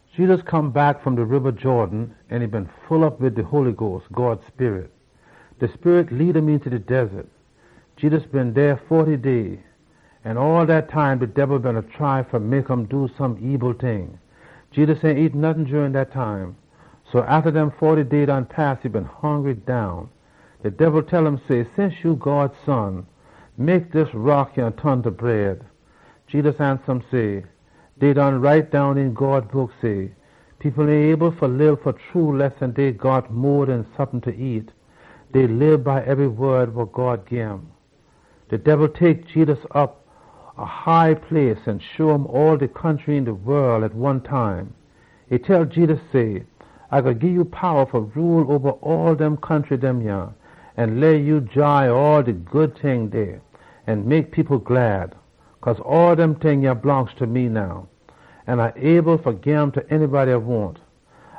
Jedus come back fom de Jerden Riba, an e been full op wid de Holy Sperit. De Sperit lead um eenta de wildaness. Jedus been dey foty day. An all dat time de Debil beena try fa mek um do some ebil ting. Jedus ain nyam nottin jurin dat time. So wen dem foty day done pass, e been hongry down. De Debil tell um say, “Since ya God Son, mek dis rock yah ton ta bread.” Jedus ansa um say, “Dey write down een God Book say, ‘People ain able fa lib fa true lessin dey got mo den sompin fa nyam. Dey lib by ebry wod wa God gim.’” De Debil tek Jedus op a high place an show um all de country een de wol at one time. E tell Jedus say, “A gwine gii ya powa fa rule oba all dem country yah an all de good ting dem dey, wa mek people too heppy. Cause all dem ting yah blongst ta me now, an A able fa gim ta anybody A wahn.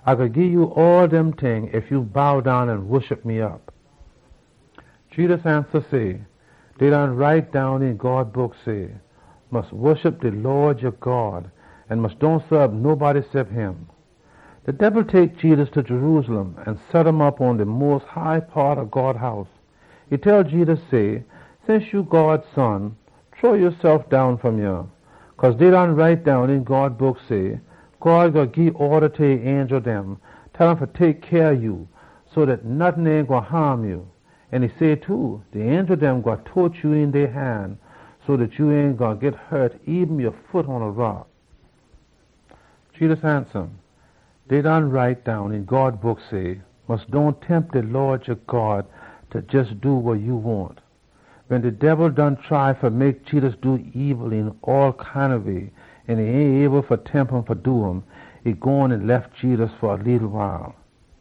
A gwine gii ya all dem ting ef ya bow down an woshup me op.” Jedus ansa um say, “Dey write down een God Book, say, ‘Mus woshup de Lawd ya God an mus dohn saab nobody cep um.’” De Debil tek Jedus ta Jerusalem an set um op pon de mos high paat ob God House. E tell Jedus say, “Since ya God Son, shrow yasef down fom yah. Cause dey write down een God Book say, ‘God gwine gii orda ta e angel dem, tell um fa tek cyah ob ya so dat nottin ain gwine haam ya.’ An e say too, ‘De angel dem gwine tote ya een dey han, so dat ya ain gwine hut eben ya foot pon a rock.’” Jedus ansa um, “Dey write down een God Book, say, ‘Mus dohn tempt de Lawd ya God fa jes do wa ya wahn.’” Wen de Debil done try fa mek Jedus do ebil een all kind ob way an e ain able fa tempt um, e gone an lef Jedus fa leetle wile.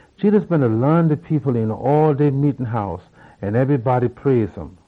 Jedus beena laan de people een all dey meetin house, an ebrybody praise um.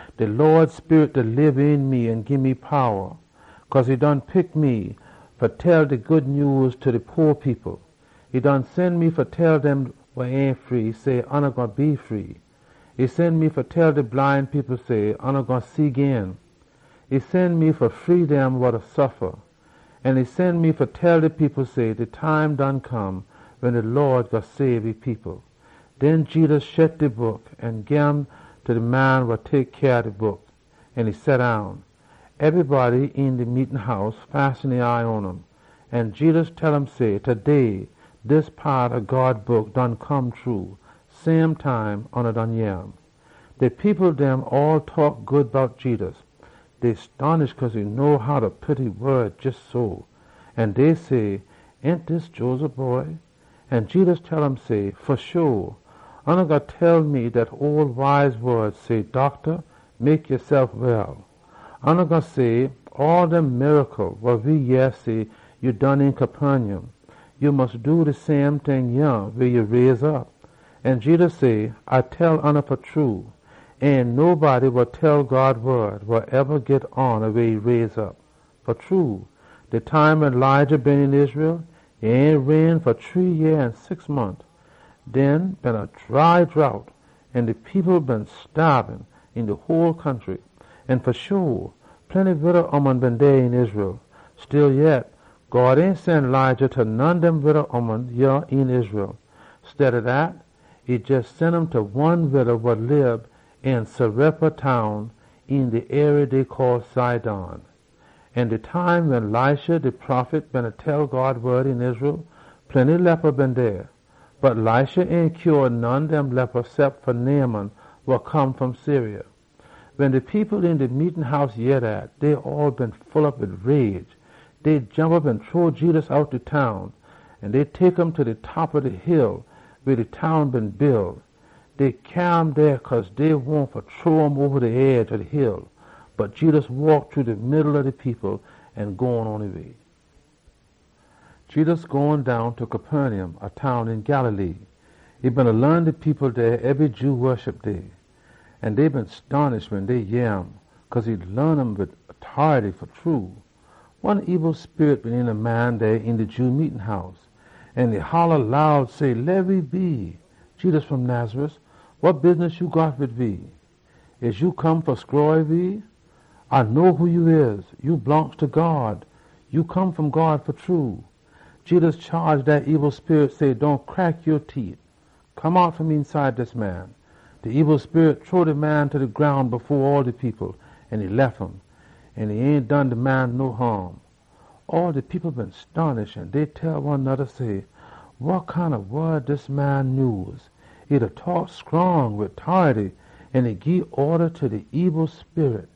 “De Sperit ob de Lawd pon me. E done pick me fa tell de Good Nyews ta de po people. E done sen me fa tell dem wa ain free, say, ‘Oona gwine be free.’ E sen me fa tell de bline people, say, ‘Oona gwine see gin.’ E sen me fa free dem wa da suffa. An e sen me fa tell de people say, ‘De time done come wen de Lawd gwine sabe e people.’” Den Jedus shet de book an gim ta de man wa tek cyah ob de book an e seddown. Ebrybody een de meetin house fasten e eye pon um. An Jedus tell um say, “Taday dis paat ob God Book done come true, same time oona yeh um.” De people dem all taak good bout Jedus. Dey stonish cause e know how fa pit e wod jes so. An dey say, “Ain dis Joseph boy?” An Jedus tell um say, “Fa sho, oona gwine tell me dat ole wise wod, say, ‘Docta, mek yasef well!’ Oona gwine say, ‘All dem miracle wa we yeh say ya done een Capernaum, ya mus do de same ting yah weh ya raise op.’” An Jedus say, “A da tell oona fa true, ain no prophet wa eba git hona weh e raise op. Fa true, de time wen Elijah been een Israel, e ain rain fa shree yeah an six mont. Dey been a dry drought, an de people beena staab een de whole country. An fa sho, plenty wida ooman been dey een Israel. Stillyet, God ain sen Elijah ta none dem wida ooman een Israel. Steada dat, e jes sen um ta one wida wa lib een Zarephath town een de arie call Sidon. An de time wen Elisha de prophet beena tell God wod een Israel, plenty people wid leposy been dey, bot Elisha ain mek none dem clean cep fa Naaman, wa come fom Syria.” Wen de people een de meetin house yeh dat, dey all been mad down. Dey jomp op an chunk Jedus outta de town. Dey tek um ta de top ob de hill weh dey town been build, fa shrow um oba de edge ob de hill. Bot Jedus waak shru de middle ob de people an gone pon e way. Jedus gone down ta Capernaum, a town een Galilee. E beena laan de people dey ebry Jew Woshup Day. An dey been stonish wen dey yeh um, cause e laan um wid tority fa true. One ebil sperit been een a man dey een de Jew meetin house, an e holla loud say, “Leh we be! Jedus fom Nazareth, wa bidness ya got wid we? Ya come fa stroy we? A know who ya da. Ya blongst ta God fa true!” Jedus chaage dat ebil sperit say, “Dohn crack ya teet! Come out fom eenside dis man!” De ebil sperit shrow de man ta de groun fo all de people, an e lef um. An e ain done de man no haam. All de people been stonish, an dey tell one noda say, “Wa kind ob wod dis man nyuse? E da taak scrong, wid tority, an e da gii orda ta de ebil sperit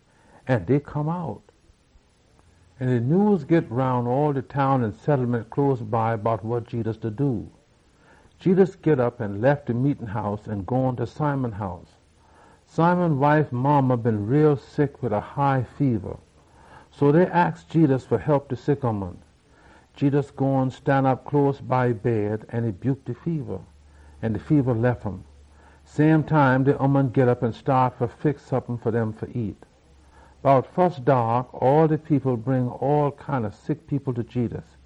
an dey come out!” An de nyews git roun all de town an settlement close by bout wa Jedus da do. Jedus git op an lef de meetin house an gone ta Simon house. Simon wife modda been bad off sick wid a high feba, so dey aks Jedus fa hep de sick ooman. Jedus gone stanop close ta e bed, an e buke de feba, an de feba lef um. Same time de ooman git op an staat fa fix sompin fa dem fa nyam. Bout fus daak, all de people bring all kind ob sick people ta Jedus.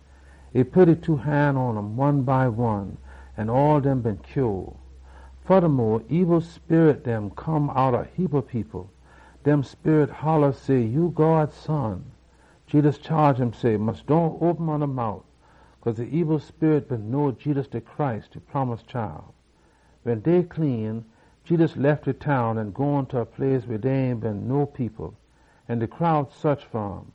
E pit e two han pon um, an all dem been heal. Fodamo, ebil sperit dem come outta a heapa people. Dem sperit holla say, “Ya God Son!” Jedus chaage um say, “Mus dohn open oona mout!” Cause de ebil sperit been know Jedus de Messiah. Wen day clean, Jedus lef de town an gone ta a place weh dey ain been no people, an de crowd saach fa um.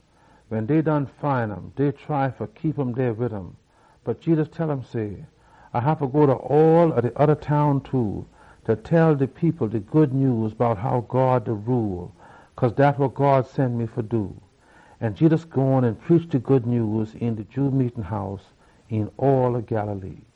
Wen dey find um, dey try fa keep um dey wid um. Bot Jedus tell um say, “A haffa go ta all de oda town dem too, fa tell de people de Good Nyews bout how God da rule, cause dat wa God sen me fa do.” An Jedus gone an preach een de Jew meetin house dem een Judea.